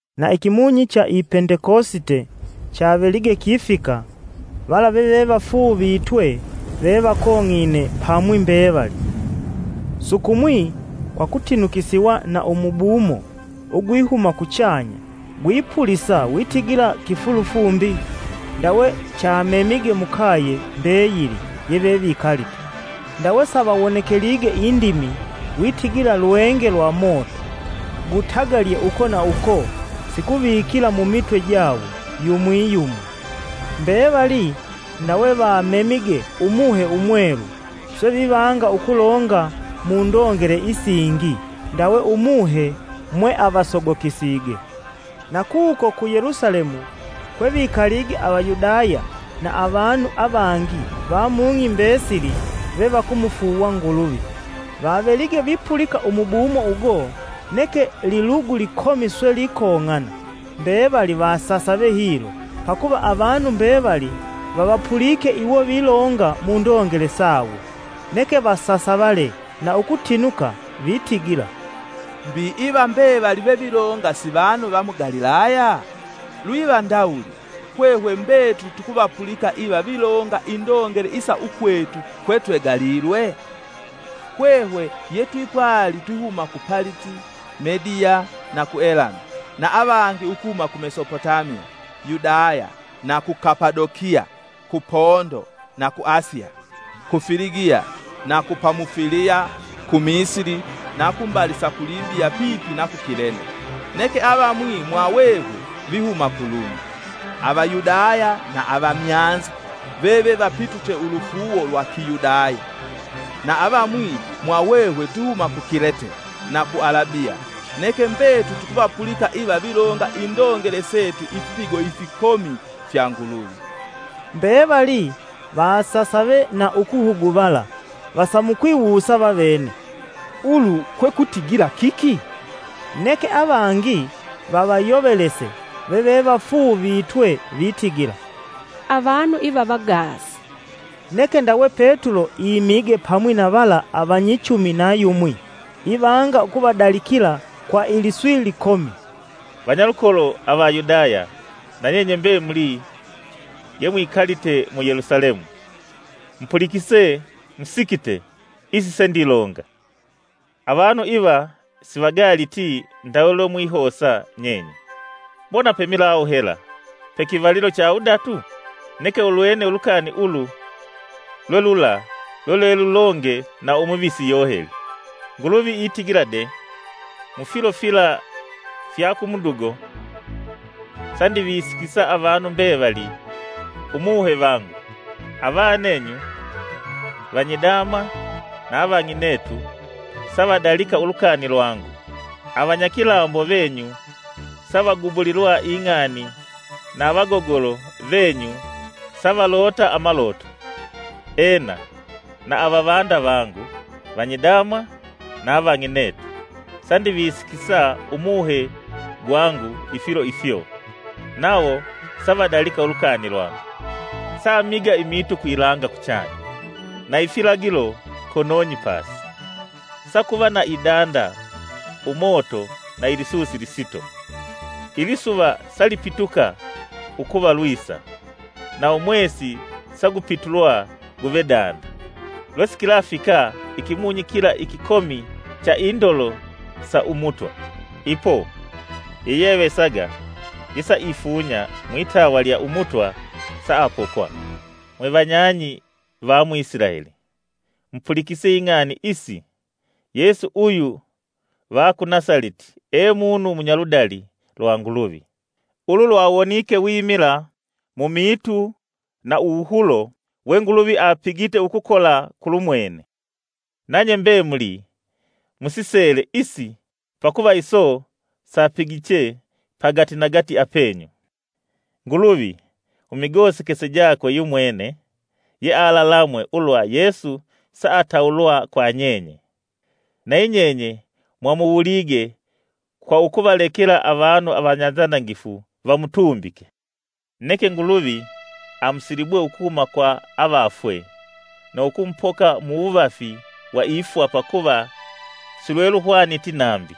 Na ikimunyi cha i Pendekosite chavelige kifika, vala vevevafuuvitwe vevakong'ine pamwi mbevali. Sukumwi kwa kutinukisiwa na umubumo ugwihuma kuchanya gwipulisa witigila kifulufumbi ndawe chamemige mukaye mbeyili yevevikalite. Ndawe savawonekelige indimi, witigila lwenge lwa moto gutagalye uko na uko sikuvikila mumitwe jawo yumwi, yumwi. Mbevali ndawe vamemige Umuhe Umwelu, swe vivanga ukulonga mundongele isingi ndawe Umuhe mweavasogokisige. Na kuko ku Yelusalemu kwe vikalige Avayudaya na avanu avangi va mung'i mbesili vevakumufuuwa Nguluvi. Vavelige vipulika umubumo ugo, neke lilugu likomi swe likong'ana, mbevali vasasave hilo, pakuva avanu mbevali vavapulike iwo vilonga mundongele sawo. Neke vasasavale na ukutinuka vitigila, “Mbi iva mbevali vevilonga si vanu va mu Galilaya? Lwiva ndawuli, hwehwe mbetuli tukuvapulika iva vilonga indongele isa ukwetu kwetwegalilwe? Hwehwe yetwipwali twihuma ku Paliti, Mediya na ku Elami, na avangi ukuhuma ku Mesopotamiya, Yudaya, na ku Kapadokiya, ku Pondo na ku Asiya, ku Filigiya, na ku Pamufiliya, ku Misili na kumbali sa ku Libiya pipi na ku Kilene; neke avamwi mwahwehwe vihuma ku Lumi, Avayudaya na Avamyanza vevevapituche ulufuuwo lwa Kiyudaya; na avamwi mwahwehwe twihuma ku Kilete na ku Alabiya. Neke mbetuli tukuvapulika iva vilonga indongele setu ifipigo ifikomi fya Nguluvi.” Mbevali vasasave na ukuhuguvala vasamukwiwusa vavene, “Ulu kwekutigila kiki?” Neke avangi vavayovelese vevevafuuvitwe, vitigila, “Avanu iva vagaasi!” Neke ndawe Petulo imige pamwi na vala avanyichumi na yumwi ivanga ukuvadalikila kwa iliswi likomi: “Vanyalukolo Avayudaya na nyenye mbemuli yemwikalite mu Yelusalemu, mupulikise musikite isi sendilonga. Avanu iva sivagaaliti ndawe lwemwihosa nyenye; mbona pemilawu hela pekivalilo cha wudatu? Neke ulwene ulukani ulu lwe lula lwelwelulonge na Umuvisi Yoheli: ‘Nguluvi itigila de, Mufilo fila fya ku mudugo, Sandivisikisa avanu mbevali Umuhe vangu. Avanenyu, vanyidama na avang'inetu, savadalika ulukani lwangu; Avanyakilambo venyu savagubulilwa ing'ani, na avagogolo venyu savalota amaloto. Ena, na avavanda vangu, vanyidama na avang'inetu, sandivisikisa Umuhe gwangu ifilo ifyo, nawo savadalika ulukani lwangu. Samiga imiitu kwilanga kuchanya, na ifilagilo konong'i pasi; sakuva na idanda, umoto na ilisusi lisito; Ilisuva salipituka ukuva lwisa, na Umwesi sagupitulwa guve danda, Lwesikilafika ikimunyi kila ikikomi cha indolo sa Umutwa. Ipo, yeyeavesaga yesaifunya mwitawa lya Umutwa saapokwa.’ “Mwevanyang'i va mu Isilaeli, mupulikise ing'ani isi! Yesu uyu va ku Nasaleti e munu munyaludali lwa Nguluvi. Ulu lwawonike wimila mu miitu na uwuhulo we Nguluvi apigite ukukola kulumwene. Nanye mbemuli musisele isi pakuva iso sapigiche pagatinagati apenyu. Nguluvi mumigosekese jakwe yumwene, yealalamwe ulwa Yesu saatawulwa kwa nyenye; nayi nyenye mwamuwulige kwa ukuvalekela avanu avanyanzanangifu vamutumbike. Neke Nguluvi amusilibwe ukuhuma kwa avafwe na ukumupoka muwuvafi wa ifwa pakuva silweluhwaniti nambi,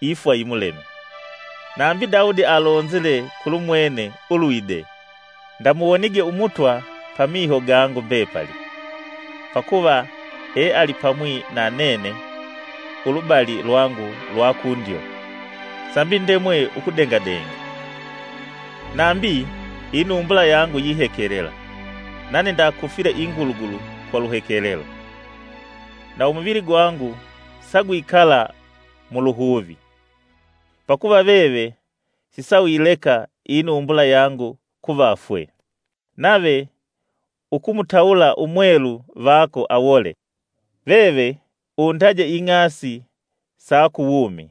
ifwa yimuleme. Nambi Daudi alonzile kulumwene ulwide: ‘Ndamuwonige Umutwa pamiho gangu mbepali; pakuva ealipamwi na nanene ulubali lwangu lwa kundyo, sambi ndemwe ukudengadenga. Nambi, inumbula yangu yihekelela, nane ndakufile ingulugulu kwa luhekelelo. Na umuvili gwangu sagwikala mu luhuvi; Pakuva veve sisauyileka inumbula yangu kuvafwe, nave ukumutawula umwelu vako awole. Veve undaje ing'asi sa ku wumi,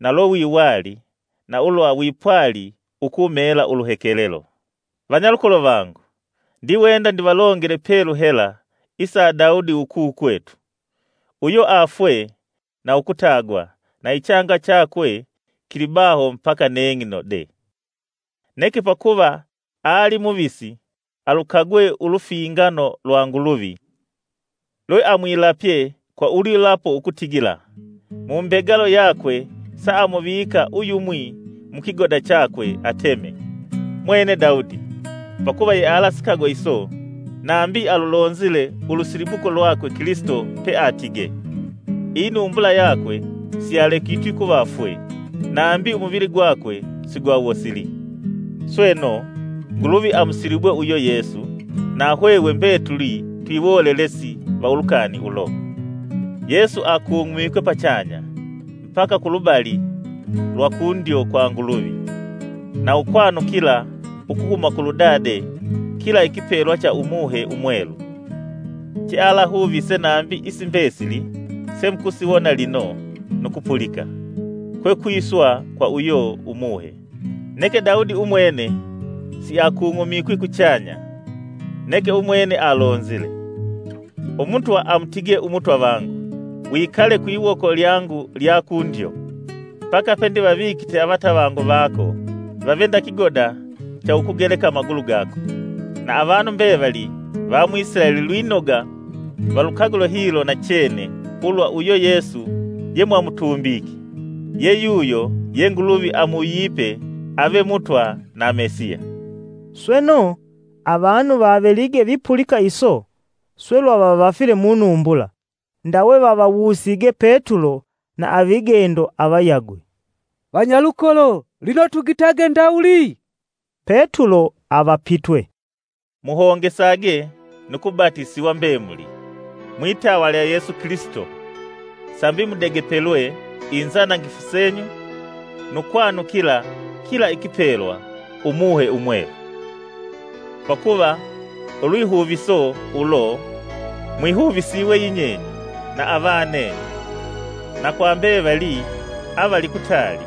na lwe wiwali, na ulwa wipwali ukumela uluhekelelo!’ “Vanyalukolo vangu, ndiwenda ndivalongele pelu hela isa Daudi ukukwetu. Uyo afwe na ukutagwa, na ichanga chakwe kilibaho mbaka neng'ino de. Neke pakuva ali muvisi, alukagwe ulufingano lwa Nguluvi lweamwilapye kwa ulwilapo ukutigila mumbegalo yakwe, samuvika uyumwi mu kigoda chakwe ateme. Mwene Daudi pakuva yealasikagwe iso nambi alulonzile ulusilibuko lwakwe Kilisito peatige. ‘Inumbula yakwe siyalekitwi kuvafwe nambi umuvili gwakwe sigwawosili.’ Sweno, Nguluvi amusilibwe uyo Yesu na hwehwe mbetuli twiwolelesi va ulukani ulo. Yesu akung'umikwe pachanya mbaka kulubali lwa kundyo kwa Nguluvi, na ukwanukila ukuhuma kulu Dade kila ikipelwa cha Umuhe Umwelu, che alavahuvise nambi isi mbesili semukusiwona lino nu kupulika, kwe kwiswa kwa uyo Umuhe. Neke Daudi umwene, siakung'umikwi kuchanya; neke umwene alonzile: ‘Umutwa amutige Umutwa vangu: Wikale kwiwoko lyangu lya kundyo, mbaka pendivavikite avatavangu vako vave nda kigoda cha ukugeleka amagulu gako.’ “Na avanu mbevali va mu Isilaeli lwinoga valukagule hilo nachene ulwa uyo Yesu yemwamutumbike, ye yuyo ye Nguluvi amuwuyipe ave Mutwa na Mesiya.” Sweno, avanu vavelige vipulika iso, swe lwavavafile munumbula, ndawe vavawusige Petulo na avigendo avayagwe: “Vanyalukolo lino tugitage ndawuli?” Petulo avapitwe, “Muhongesage nu kubatisiwa mbemuli, mwitawa lya Yesu Kilisito, sambi mudegepelwe inzanangifu senyu, nu kwanukila kila ikipelwa, Umuhe Umwelu. Pakuva ulwihuviso ulo mwihuvisiwe yinyenye na avanenyu, na kwa mbevali avali kutali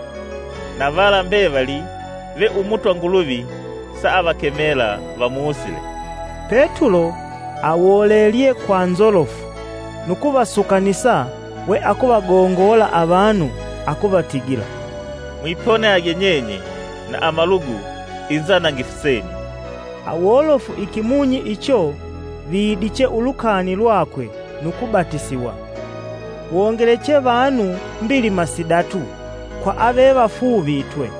na vala mbevali ve Umutwa Nguluvi saavakemela vamusile.” Petulo awolelelye kwa nzolofu, nu kuvasukanisa we akuvagongola avanu akuvatigila, “Mwiponiage nyenye na amalugu inzanangifu senyu.” Awolofu ikimunyi icho, vidiche ulukani lwakwe nu kubatisiwa. Wongeleche vanu mbilima sidatu kwa avevafuuvitwe.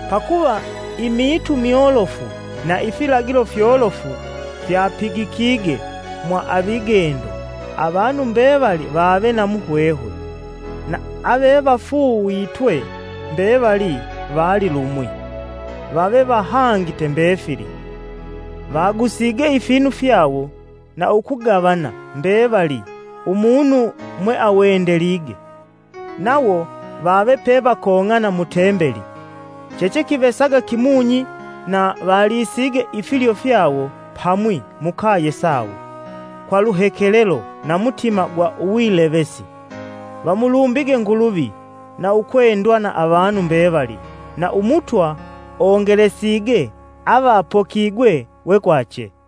Pakuva imiitu myolofu na ifilagilo fyolofu fyapigikige mwa avigendo, avanu mbevali vave na muhwehwe. Na avevafuuvitwe mbevali vali lumwi, vave vahangite mbefili. Vagusige ifinu fyawo, na ukugavana mbevali, umunu mweawendelige. Nawo vave pevakong'ana mu Tembeli chechekivesaga kimunyi na valisige ifilyo fyawo pamwi mukaye sawo kwa luhekelelo na mutima gwa uwilevesi, Vamulumbige Nguluvi, na ukwendwa na avanu mbevali. Na Umutwa ongelesige avapokigwe we kwache.